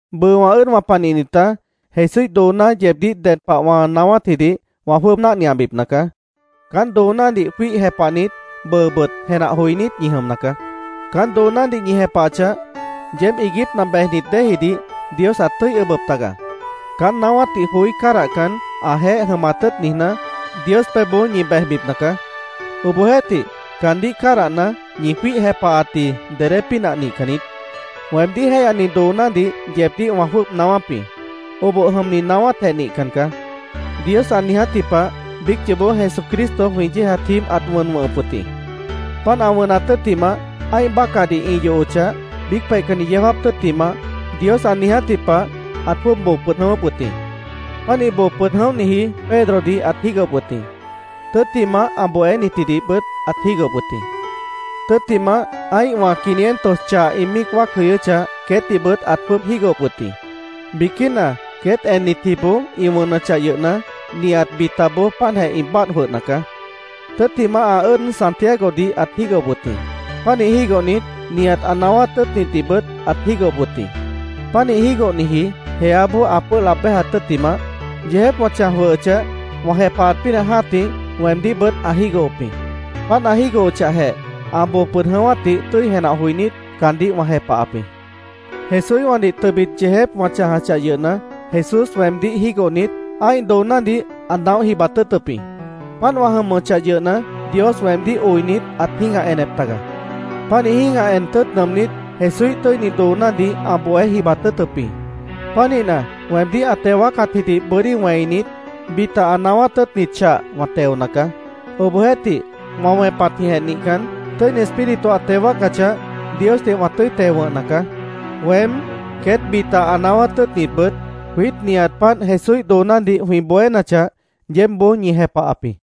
Bʉʉ wã ʉ́ʉdwã panihnitá, Jesúíh dooná yeebdíh ded pah wã naáwátjidih wã jwʉ́ʉb náhniabipna caá. Caán doonádih jwíih jepahnit, bʉʉbʉt jenah joinít ñi jʉmna caá. Caán doonádih ñi jepahachah, yeéb iiguípna bejnit déejidih Dios ãt tʉ́i ʉbʉp taga. Caán naáwátdih joí cádahcan, ãjeéh jʉmat tʉ́ʉt niijná, Dios pebhboó ñi bejbipna caá. Obohjeéhtih, caandíh cádahna, ñi jwíih jepahatji dedé pínah nihcan niít. Weemdíh jéihyani doonádih yeebdíh wã jwʉ́ʉb naáwáp jĩ. Oboh jʉmni naáwátjeh nihcan caá. Dios ã niijátji pah biíc yoobó Jesucristo jwĩ yéejat jíib ãt wʉn wʉ̃hʉp wʉt jĩ. Páant ã wʉnat tʉ́ttimah, ã́ih bácahdih ĩ yohochah, biíc peihcanni yeó jáap tʉ́ttimah, Dios ã niijátji pah, ãt jwʉ́ʉb boo pʉd jʉ̃ʉ́wʉ́p wʉt jĩ. Pánih boo pʉd jʉ̃óhniji, Pedrodih ãt jígohop wʉt jĩ. Tʉ́ttimah, ã bohénitjidihbʉt ãt jígohop wʉt jĩ. Tʉ́ttimah, ã́ihwã quinientos chah ĩ míic wáac jʉyʉ́chah, queétdihbʉt ãt jwʉ́ʉb jígohop wʉt jĩ. Biquína queét ennitjiboó ĩ wʉnʉchah yʉhna, nihat bitaboó páantjeh ĩ báadh jwʉhna caá. Tʉ́ttimah, ã ʉ́ʉd Santiagodih ãt jígohop wʉt jĩ. Pánih jígohnit, nihat ã naáwát tʉ́ʉtnitdihbʉt ãt jígohop wʉt jĩ. Pánih jígohniji jeáboó ã pʉ́ʉh laab béjat tʉ́ttimah, yeejép wã chãj jwʉhʉchah, wã jepahat pínah jã́tih, weemdíhbʉt ã jígohop jĩ. Páant ã jígohochahjeh, ã boo pʉd jʉ̃ʉ́wátdih tʉ́i jenah joinít, caandíh wã jepahap jĩ. Jesúíhwãdih tʉbit yeejép wã chãjachah yʉhna, Jesús weemdíh jígohnit, ã́ih doonádih ã naóh jibat tʉ́ʉtʉp jĩ. Páant wã jʉmʉchah yʉhna, Dios weemdíh oinit, ãt jĩ́gah enep taga. Pánih jĩ́gah en tʉ́ʉt nʉʉmnít, Jesúíh tʉ́ini doonádih ã bohé jibat tʉ́ʉtʉp jĩ. Pánihna, weemdíh ã teo wáacatjidih bʉ́dí wẽinit, bita ã naáwát tʉ́ʉtnit chah wã teona caá. Obohjeéhtih, wã wẽpatjĩhjeh nihcan, Tʉ́ini Espíritu ã teo wáacachah, Diosdih wã tʉ́i teo wʉ̃hna caá. Weém, queét bita ã naáwát tʉ́ʉtnitbʉt, jwiít nihat páant Jesúíh doonádih jwĩ bohénachah, yeébboó ñi jepahap jĩ.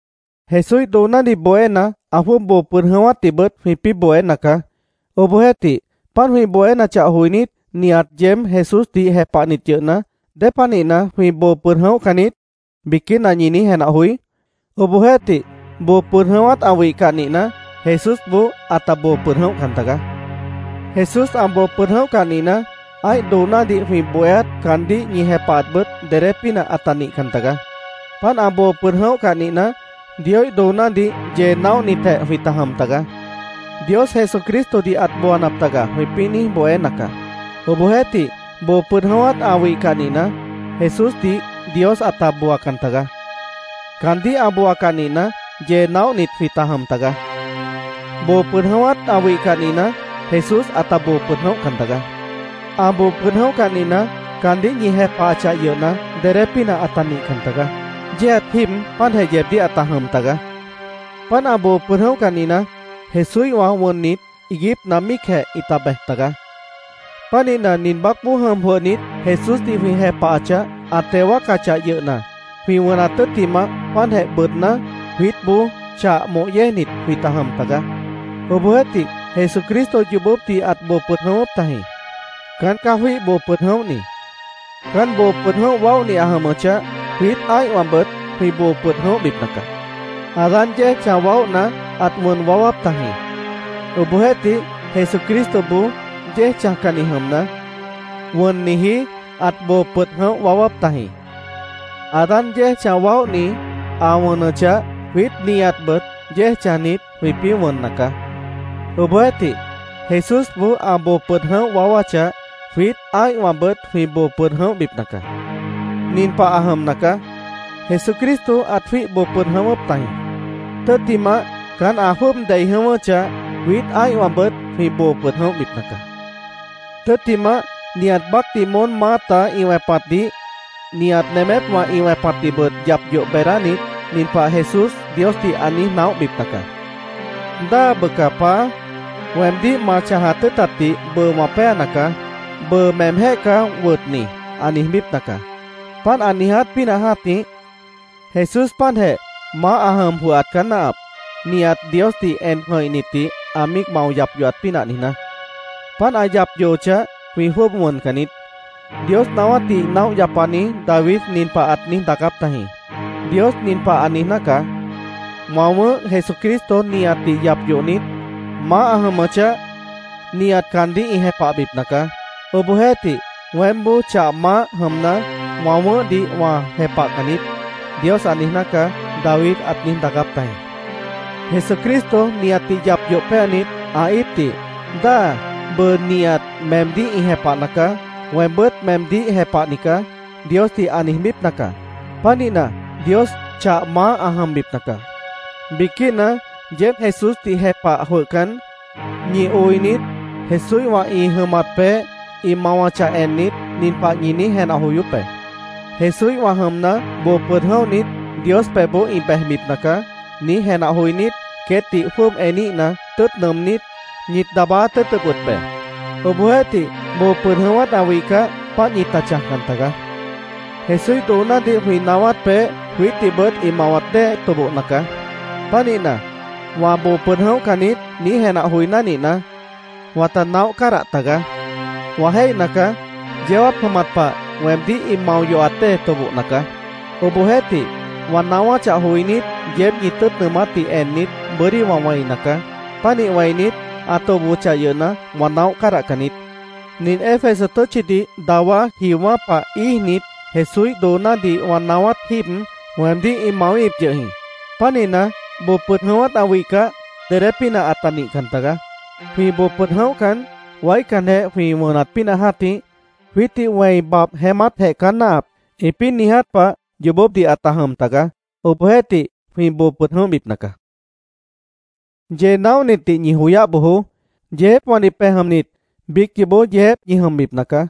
Jesúíh doonádih bohéna, ã jwʉ́ʉb boo pʉd jʉ̃ʉ́wátdihbʉt jwĩpĩ́ bohéna caá. Obohjeéhtih, páant jwĩ bohénachah joinít, nihat yeéb Jesúsdih jepahnit yʉhna, ¿Dépanihna “Jwĩ boo pʉd jʉ̃óhcan niít”, biquína ñi niíj jenah joí? Obohjeéhtih, boo pʉd jʉ̃ʉ́wát ã wihcah nihna, Jesúsboó ãta boo pʉd jʉ̃óhcan tagaá. Jesús ã boo pʉd jʉ̃óhcah nihna, ã́ih doonádih jwĩ bohéát, caandíh ñi jepahatbʉt dedé pínah ãta nihcan tagaá. Páant ã boo pʉd jʉ̃óhcah nihna, Dioíh doonádih yee naóhnitjeh jwĩta jʉm taga. “Dios Jesucristodih ãt booanap taga”, jwĩpĩ́ niíj bohéna caá. Obohjeéhtih, boo pʉd jʉ̃ʉ́wát ã wihcah nihna, Jesúsdih Dios ãta booacan tagaá. Caandíh ã booacah nihna, yee naóhnit jwĩta jʉm tagaá. Boo pʉd jʉ̃ʉ́wát ã wihcah nihna, Jesús ãta boo pʉd jʉ̃óhcan tagaá. Ã boo pʉd jʉ̃óhcah nihna, caandíh ñi jepahachah yʉhna, dedé pínah ãta nihcan tagaá. Yéejat jíib páantjeh yeebdíh ãta jʉm tagaá. Páant ã boo pʉd jʉ̃óhcah nihna, Jesúíhwã wʉnnit, iiguípna míicjeh ĩta bej tagaá. Pánihna, nin baácboó jʉm jwʉhnit, Jesúsdih jwĩ jepahachah, ã teo wáacachah yʉhna, jwĩ wʉnat tʉ́ttimah páantjeh bʉʉdná, jwiítboó chah moh yéejnit jwĩta jʉm taga. Obohjeéhtih, Jesucristo yoobópdih ãt boo pʉd jʉ̃ʉ́wʉ́p tajĩ. Caán caá jwíih boo pʉd jʉ̃óhni. Caán boo pʉd jʉ̃óh waóhni ã jʉmʉchah, jwiít ã́ihwãbʉt jwĩ boo pʉd jʉ̃óhbipna caá. Adán yéej chãj waóhna, ãt wʉn waáwáp tajĩ. Obohjeéhtih, Jesucristoboó yéej chãjcanni jʉmna, wʉnniji ãt boo pʉd jʉ̃óh waáwáp tajĩ. Adán yéej chãj waóhni, ã wʉnʉchah, jwiít nihatbʉt yéej chãjnit, jwĩpĩ́ wʉnna caá. Obohjeéhtih, Jesúsboó ã boo pʉd jʉ̃óh waáwáchah, jwiít ã́ihwãbʉt jwĩ boo pʉd jʉ̃óhbipna caá. Nin pah ã jʉmna caá: Jesucristo ãt jwíih boo pʉd jʉ̃ʉ́wʉ́p tajĩ. Tʉ́ttimah, caán ã jwʉ́ʉb dei jʉ̃ʉ́wʉ́chah, jwiít ã́ihwãbʉt jwĩ boo pʉd jʉ̃óhbipna caá. Tʉ́ttimah, nihat baácdih moón maáta ĩ wẽpatdih, nihat nemépwã ĩ wẽpatdihbʉt yap yoh beedánit, nin pah Jesús Diosdih ã niíj naóhbipna caá: “Dáa bʉca, Paá, weemdíh ma chãjat tʉ́ʉtatdih bʉʉ wã péana caá. Bʉʉ meemjéh caá wʉtni”, ã niijbípna caá. Páant ã niiját pínah jã́tih, Jesús páantjeh maáh ã jʉm jwʉhat caá náahap, nihat Diosdih en jʉ̃ihnitdih ã míic mao yap yohat pínah niijná. Páant ã yap yohochah, jwĩ jwʉ́ʉb wʉncan niít. Dios naáwátdih naóh yapani David nin pah ãt niíj daacáp tajĩ: “Dios nin pah ã niijná caá: ‘Wã wʉ̃ʉ́h Jesucristo nihatdih yap yohnit, maáh ã jʉmʉchah, nihat caandíh ĩ jepahbipna caá. Obohjeéhtih, weémboó chah maáh jʉmna, wã wʉ̃ʉ́hdih wã jepahcan niít’, Dios ã niijná caá”, David ãt niíj daacáp tajĩ. Jesucristo nihatdih yap yoh péanit, ã íipdih “Dáa, bʉʉ nihat meemdíh ĩ jepahna caá. Weembʉ́t meemdíh jepahni caá”, Diosdih ã niijbípna caá. Pánihna, Dios chah maáh ã jʉmbipna caá. Biquína yeéb Jesúsdih jepah jwʉhcan, ñi oinit Jesúíhwã ĩ jʉmat peéh, ĩ mawachah ennit, nin pah ñi niíj jenah joyóp be: “Jesúíhwã jʉmna, boo pʉd jʉ̃óhnit, Dios pebhboó ĩ bejbipna caá”, niíj jenah joinít, queétdih jwʉ́ʉb eníhna, tʉ́ʉt nʉʉmnít, ñit daabáát tʉ́ʉtʉp wʉt be. Obohjeéhtih, boo pʉd jʉ̃ʉ́wát ã wihcah, páant ñita chãjcan tagaá. Jesúíh doonádih jwĩ naáwát peéh, jwiítdihbʉt ĩ mawat dée tobohna caá. Pánihna, “Wã boo pʉd jʉ̃óhcan niít”, niíj jenah joiná nihna, wãta naóh cádah tagaá. Wã jéihna caá, yeó jáap jʉmat pah weemdíh ĩ mao yohat dée tobohna caá. Obohjeéhtih, wã naáwáchah joinít, yeéb ñi tʉ́ʉt nʉʉmátdih ennit, bʉ́dí wã wẽina caá. Pánih wẽinit, ã tobohochah yʉhna, wã naóh cádahcan niít. Nin Éfeso tʉ́tchidih dawá jiowã́ pah íijnit, Jesúíh doonádih wã naáwát jíib, weemdíh ĩ mawíhip yʉh jĩ. Pánihna, boo pʉd jʉ̃ʉ́wát ã wihcah, dedé pínah ãta nihcan tagaá. Jwĩ boo pʉd jʉ̃óhcan, “Waícanjeh jwĩ wʉnat pínah jã́tih, jwiítdih wẽi babh jeémátjeh caá náahap”, ĩpĩ́ niiját pah yoobópdih ãta jʉm taga. Obohjeéhtih jwĩ boo pʉd jʉ̃óhbipna caá. Yee naóhnitdih ñi joyáh bojoó. “Yeejépwãdih pej jʉmnit, biíc yoobó yeejép ñi jʉmbipna caá”,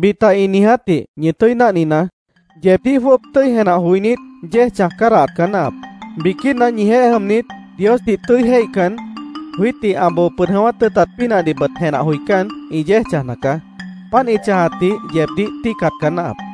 bita ĩ niijátdih ñi tʉ́i náhninaá. Yeebdíh jwʉ́ʉb tʉ́i jenah joinít, yéej chãj cádahat caá náahap. Biquína ñijeéh jʉmnit Diosdih tʉ́i jéihcan, jwiítdih ã boo pʉd jʉ̃ʉ́wát tʉ́ʉtat pínahdihbʉt jenah joicán, ĩ yéej chãjna caá. Páant ĩ chãjatdih yeebdíh tíicat caá náahap.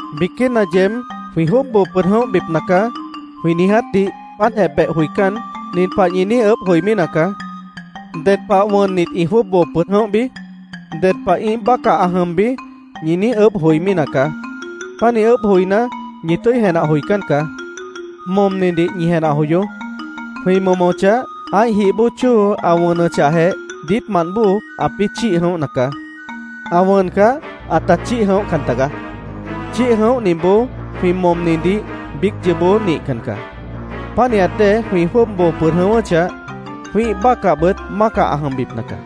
Biquína yeéb “Jwĩ jwʉ́ʉb boo pʉd jʉ̃óhbipna caá”, jwĩ niijátdih páantjeh beh joicán, nin pah ñi niíj ʉʉ́bh joimí nacaá. ¿Ded pah wʉnnit ĩ jwʉ́ʉb boo pʉd jʉ̃óhbi? ¿Ded pah ĩ́ih bácah ã jʉmbi? ñi niíj ʉʉ́bh joimí nacaá. Pánih ʉʉ́bh joiná, ñi tʉ́i jenah joicán caá. Momnidih ñi jenah joyoó. Jwĩ momochah, ã́ih jih bóo chóo ã wʉnʉchahjeh, diítmant bóo ãpĩ́ chíih jʉ̃óhna caá. Ã wʉncah, ãta chíih jʉ̃óhcan taga. Chíih jʉ̃óhniboó jwĩ momnidih biíc yoobó nihcan caá. Pánihat dée jwĩ jwʉ́ʉb boo pʉd jʉ̃ʉ́wʉ́chah, jwĩ́ih bácahbʉt mácah ã jʉmbipna caá.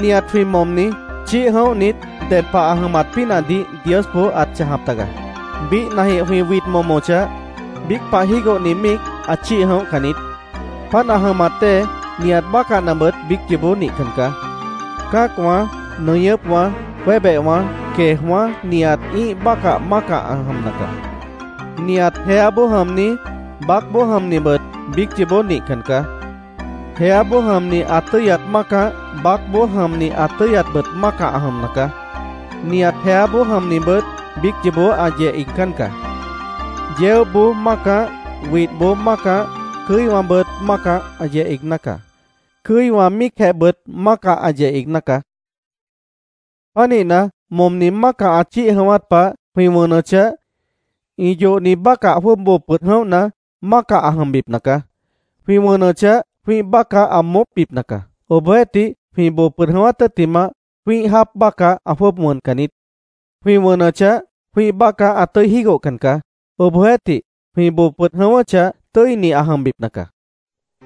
Nihat jwĩ momni chíih jʉ̃óhnit ded pah ã jʉmat pínahdih Diosboó ãt chãjap taga. Biíhnajĩh jwĩ wid momochah, biíc pah jígohni míic ã chíih jʉ̃óhcan niít. Páant ã jʉmat dée nihat bácahnabʉt biíc yoobó nihcan caá. Cã́acwã, nʉñʉ́pwã, jwébehwã, queejwã́ nihat ĩ́ih bácah mácah ã jʉmna caá. Nihat jeáboó jʉmni, baácboó jʉmnibʉt biíc yoobó nihcan caá. Jeáboó jʉmni ã tʉ́yat mácah, baácboó jʉmni ã tʉ́yatbʉt mácah ã jʉmna caá. Nihat jeáboó jʉmnibʉt biíc yoobó ã yeh iigcán caá. Yeóboó mácah, widhboó mácah, cʉ́iwãbʉt mácah ã yeh iigná caá. Cʉ́iwã míicjehbʉt mácah ã yeh iigná caá. Pánihna, momni mácah ã chíih jʉ̃ʉ́wát pah, jwĩ wʉnʉchah, ĩ yohni bácah jwʉ́ʉb boo pʉd jʉ̃óhna, mácah ã jʉmbipna caá. Jwĩ wʉnʉchah, jwĩ́ih bácah ã moópbipna caá. Obohjeéhtih, jwĩ boo pʉd jʉ̃ʉ́wát tʉ́ttimah, jwĩ́ih jáap bácah ã jwʉ́ʉb moópcan niít. Jwĩ wʉnʉchah, jwĩ́ih bácah ã tʉ́i jígohcan caá. Obohjeéhtih, jwĩ boo pʉd jʉ̃ʉ́wʉ́chah, tʉ́ini ã jʉmbipna caá.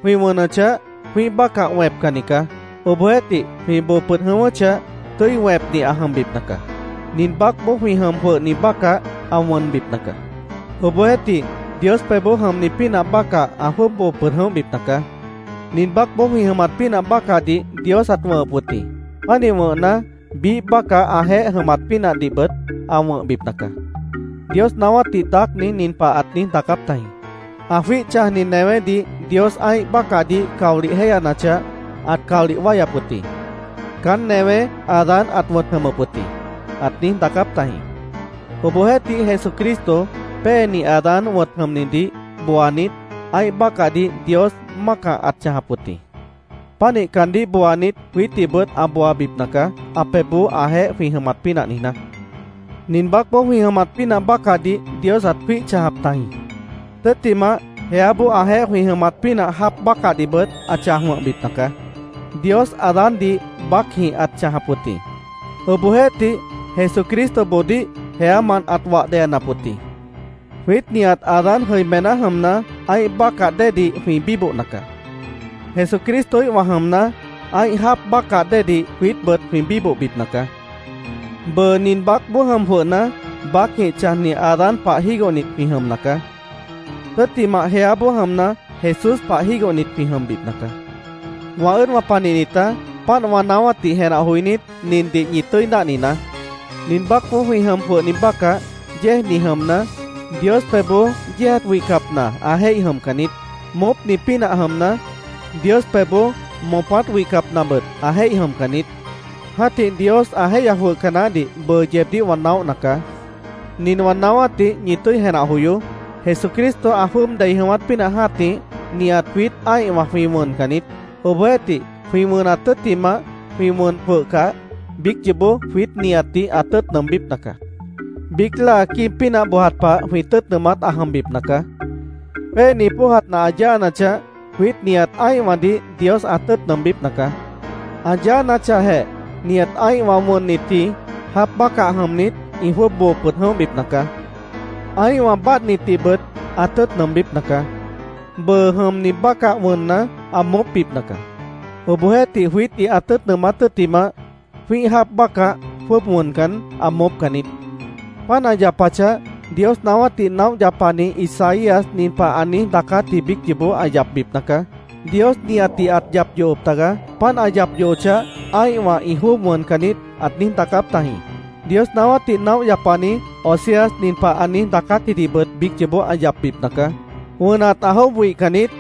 Jwĩ wʉnʉchah, jwĩ́ih bácah wẽpcanni caá. Obohjeéhtih, jwĩ boo pʉd jʉ̃ʉ́wʉ́chah, tʉ́i wẽpni ã jʉmbipna caá. Nin baácboó jwĩ jʉm jwʉhni bácah ã wʉnbipna caá. Obohjeéhtih, Dios pebhboó jʉmni pínah bácah ã jwʉ́ʉb boo pʉd jʉ̃óhbipna caá. Nin baácboó jwĩ jʉmat pínah bácahdih Dios ãt wʉ̃hʉp wʉt jĩ. Pánih wʉ̃hna, biíh bácah ãjeéh jʉmat pínahdihbʉt ã wʉ̃hbipna caá. Dios naáwátdih daácni nin pah ãt niíj daacáp tajĩ: “Ã jwíih chãjni newédih Dios ã́ih bácahdih caolih jéyanachah, ãt caolih wáyap wʉt jĩ. Caán newé Adán ãt wʉ̃t jʉmʉp wʉt jĩ”, ãt niíj daacáp tajĩ. Obohjeéhtih Jesucristo, Péeni Adán wʉ̃t jʉmnidih booanit, ã́ih bácahdih Dios mácah ãt chãjap wʉt jĩ. Pánih caandíh booanit, jwiítdihbʉt ã booabipna caá, ã pebhboó ãjeéh jwĩ jʉmat pínah niijná. Nin baácboó jwĩ jʉmat pínah bácahdih Dios ãt jwíih chãjap tajĩ. Tʉ́ttimah, jeáboó ãjeéh jwĩ jʉmat pínah jáap bácahdihbʉt ã chãj wʉ̃hbipna caá. Dios Adándih baácjĩh ãt chãjap wʉt jĩ. Obohjeéhtih, Jesucristoboodíh jeámant ãt wah deyanap wʉt jĩ. Jwiít nihat Adán jʉimená jʉmna, ã́ih bácah déedih jwĩ bíbohna caá. Jesucristoíhwã jʉmna, ã́ih jáap bácah déedih jwiítbʉt jwĩ bíbohbipna caá. Bʉʉ nin baácboó jʉm jwʉhna, baácjĩh chãjni Adán pah jígohnit jwĩ jʉmna caá. Tʉ́ttimah, jeáboó jʉmna, Jesús pah jígohnit jwĩ jʉmbipna caá. Wã ʉ́ʉdwã panihnitá, páant wã naáwátdih jenah joinít, nindih ñi tʉ́i náhninaá: Nin baácboó jwĩ jʉm jwʉhni bácah, yéejni jʉmna, Dios pebhboó yéejat wihcapna ã jéih jʉmcan niít. Moópni pínah jʉmna, Dios pebhboó moopát wihcapnabʉt ã jéih jʉmcan niít. Jã́tih Dios ã jéihya jwʉhca naáhdih bʉʉ yeebdíh wã naóhna caá. Nin wã naáwátdih ñi tʉ́i jenah joyoó: Jesucristo ã jwʉ́ʉb dei jʉ̃ʉ́wát pínah jã́tih, nihat jwiít ã́ihwã jwĩ wʉncan niít. Obohjeéhtih, jwĩ wʉnat tʉ́ttimah, jwĩ wʉn jwʉhcah, biíc yoobó jwiít nihatdih ã tʉ́ʉt nʉʉmbípna caá. Biíc láa quíib pínah bojat pah jwĩ tʉ́ʉt nʉʉmát ã jʉmbipna caá. Péeni póojat nah ã yáanachah, jwiít nihat ã́ihwãdih Dios ã tʉ́ʉt nʉʉmbípna caá. Ã yáanachahjeh, nihat ã́ihwã wʉnnitji jáap bácah jʉmnit ĩ jwʉ́ʉb boo pʉd jʉ̃óhbipna caá. Ã́ihwã báadhnitdihbʉt ã tʉ́ʉt nʉʉmbípna caá. Bʉʉ jʉmni bácah wʉnna, ã moópbipna caá. Obohjeéhtih, jwiítdih ã tʉ́ʉt nʉʉmát tʉ́ttimah, jwĩ́ih jáap bácah jwʉ́ʉb wʉncan, ã moópcan niít. Páant ã yapachah, Dios naáwátdih naóh yapani Isaías nin pah ã niíj daacátji biíc yoobó ã yapbipna caá: “Dios nihatdih ãt yap yohop tagaá. Páant ã yap yohochah, ã́ihwã ĩ jwʉ́ʉb wʉncan niít”, ãt niíj daacáp tajĩ. Dios naáwátdih naóh yapani Oseas nin pah ã niíj daacátjidihbʉt biíc yoobó ã yapbipna caá: “¡Wʉnat ã jwʉ́ʉb wihcan niít!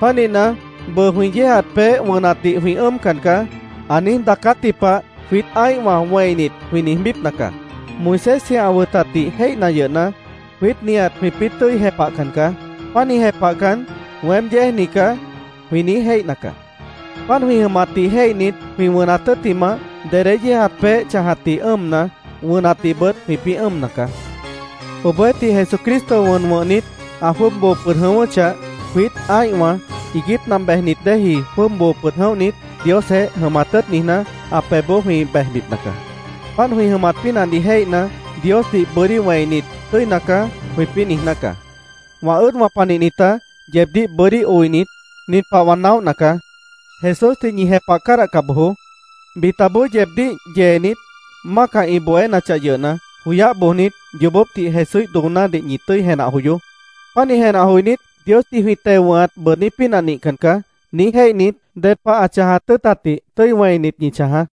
Pánihna, bʉʉ jwĩ yéejat peéh wʉnatdih jwĩ ʉ́ʉmcan caá”, ã niíj daacátji pah jwiít ã́ihwã wẽinit, jwĩ niijbípna caá. Moisésji ã wʉtatdih jéihna yʉhna, jwiít nihat jwĩpĩ́ tʉ́i jepahcan caá. Pánih jepahcan, “Weém yéejni caá”, jwĩ niíj jéihna caá. Páant jwĩ jʉmatdih jéihnit, jwĩ wʉnat tʉ́ttimah, dedé yéejat peéh chãjatdih ʉ́ʉmna, wʉnatdihbʉt jwĩpĩ́ ʉ́ʉmna caá. Obohjeéhtih, Jesucristo wʉn wʉ̃hnit, ã jwʉ́ʉb boo pʉd jʉ̃ʉ́wʉ́chah, jwiít ã́ihwã iiguípna bejnit déeji jwʉ́ʉb boo pʉd jʉ̃óhnit, Diosjeéh jʉmat tʉ́ʉt niijná, ã pebhboó jwĩ bejbipna caá. Páant jwĩ jʉmat pínahdih jéihna, Diosdih bʉ́dí wẽinit, “Tʉ́ina caá”, jwĩpĩ́ niijná caá. Wã ʉ́ʉdwã panihnitá, yeebdíh bʉ́dí oinit, nin pah wã naóhna caá: Jesúsdih ñi jepah cádahca bojoó. Bitaboó yeebdíh yeenit, mácah ĩ bohénachah yʉhna, joyáh bojnit, yoobópdih Jesúíh doonádih ñi tʉ́i jenah joyoó. Pánih jenah joinít, “Diosdih jwĩ teo wʉ̃hat bʉʉdní pínah nihcan caá”, niíj jéihnit, ded pah ã chãjat tʉ́ʉtatdih tʉ́i wẽinit, ñi chãjaá.